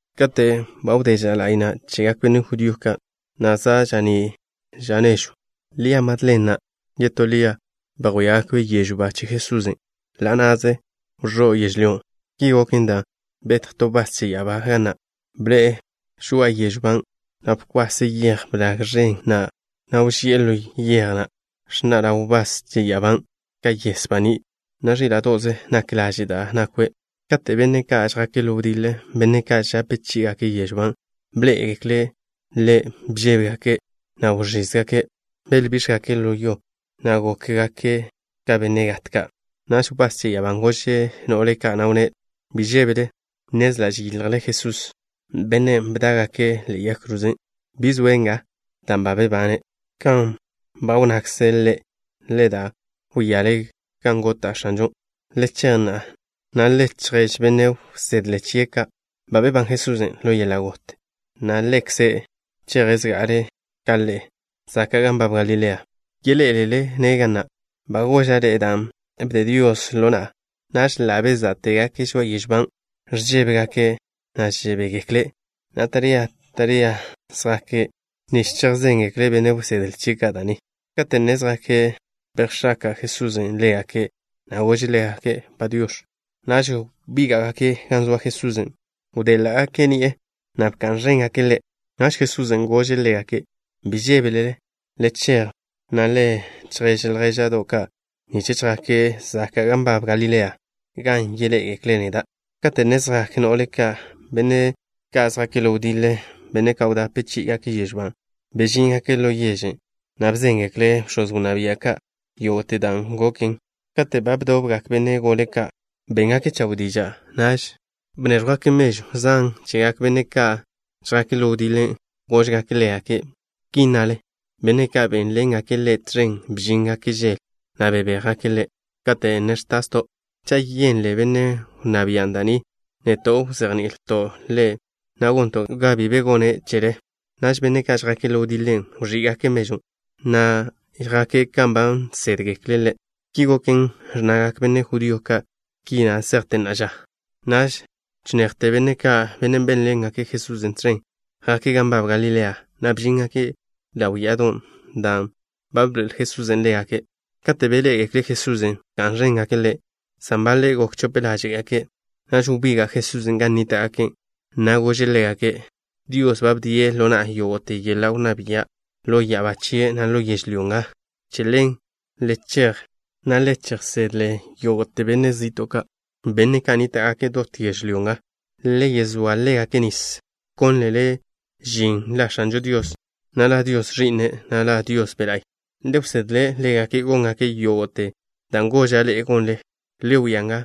Kate' ba wdé ža la'y na' chegak benne' judío ka', na' za' ža'ní' ža nežw, Lia Madlen na' yetó Lia bejwíagake' yežw ba che Jesusen'. Ḻa' na'ze wẕó' yežlyó. Ki goken dan' betj to wbás che ya'abá ga na'. Bḻe'e žoa'a yežw ban', na' bkwase' yej blag ẕen na', na' wži'e ḻo yej na'. Ẕnna' ḻaw wbás che ya'abán' ka yes baní', na' ẕíla'do'ze nak laže' da' nakwe'. Kate' benne' ka' žjake' ḻo wdiḻe, benne' ka' žape chí'igake' yežw ban', bḻé'egekle' ḻe', bžébegake', na' wẕízgake'. Belbíx̱jgake' ḻo yo, na' gókgake' ka benne' gat ka'. Naž wbás che ya'abán' gože' no'le ka', na' wnné': —Bi žébele. Nnezla' žeyiljle Jesús, bennen' bdá'gake' ḻe'e yag kroze. Bi zoe' nga dan' ba bebane' kan ba wnnakze' Ḻe'. Le da, wíale gan gota' X̱anžon'. Le chej na'a, na' le chjap benne' wsedle chie' ka' ba bebán Jesusen' ḻo yeḻa' got, na' Ḻekze' cheje' zga'ale' ka ḻe'e zaka' gan nbab Galilea. Yeḻé'elele-ne' ga na'. Ba goža' ḻe'e dan' bde Dios ḻo na'a. Naž ḻa' bezá'tegake' žoa'a yežw ban'. Ẕžébegake', na' žebégekle', na' taría taríagake' zjake' nich chejzéngekle' benne' wsedle chie' ka' da' ni. Kate' ne zjake', bejx̱aka' Jesusen' ḻégake', na' gože' ḻégake': —Padiox̱. Naž wbíga'gake' gan zoa Jesusen'. Byéḻa'gake' ni'e, na' bka'n ẕéngake' Ḻe'. Naž Jesusen' gože' ḻégake': —Bi žébele. Le chej, na' le chjap ljéža'do' ka' nich chjake' zaka' gan nbab Galilea, gan yeḻé'egekle' neda'. Kate' ne zjak no'le ka', benne' ka' žjake' ḻo wdiḻe, benne' ka' wdape chí'igake' yežw ban', bežíngake' ḻo yežen', na' bzéngekle' bx̱oz wnná bia' ka' yógo'te dan' goken. Kate' ba bdobgak benne' gole ka', béngake' chawe' diža'. Naž bnéẕjwgake' mežw zan chegak benne' ka' žjake' ḻo wdiḻe. Góžgake' ḻégake': —Ki nnale: “Benne' ka' bénlengake' ḻe' tẕen bžíngake' žele, na' bebéjgake' Ḻe' kate' ne ẕtasto'.” Cha' yenle benne' wnná bian' da' ni, neto' wzejni'ilto' ḻe', na' gonto' ga bi be gone' chele. Naž benne' ka' žjake' ḻo wdiḻe wẕí'gake' mežwn', na' yjéngake' kan ba nsédgekle'. Ki goken, ẕnnagak benne' judío ka' ki na' zejte na'a ža. Naž chinejte benne' ka', benne' bénḻengake' Jesusen' tẕen, jake' gan nbab Galilea, na' bžíngake' ḻaw ya'adon', dan' ba bḻoe'el Jesusen' ḻégake'. Kate' beḻé'egekle' Jesusen', bka'n ẕéngake' Ḻe', san baḻe' gok chope ḻáže'gake'. Naž wbiga' Jesusen' gan nníta'gake', na' gože' ḻégake': —Dios ba bdie' ḻo na'a yógo'te yeḻa' wnná bia' ḻo ya'abá chie', na' ḻo yežlyó nga. Che ḻen le chej, na' le chejsedle yógo'te benách zi'to' ka', benne' ka' nníta'gake' dot yežlyó nga. Le yezóa ḻégake' nis, wkónlele žin La X̱ažo Dios, na' La Dios Ẕi'n, na' La Dios Be' La'y. Le wsedle ḻégake' góngake' yógo'te dan' goža' ḻe'e gonle. Le wia nga,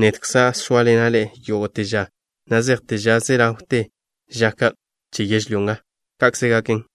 nedkza' zóaḻena' ḻe'e yógo'te ža na' zejte ža ze ḻawte ža ka' che yežlyó nga. Ka'kze gaken.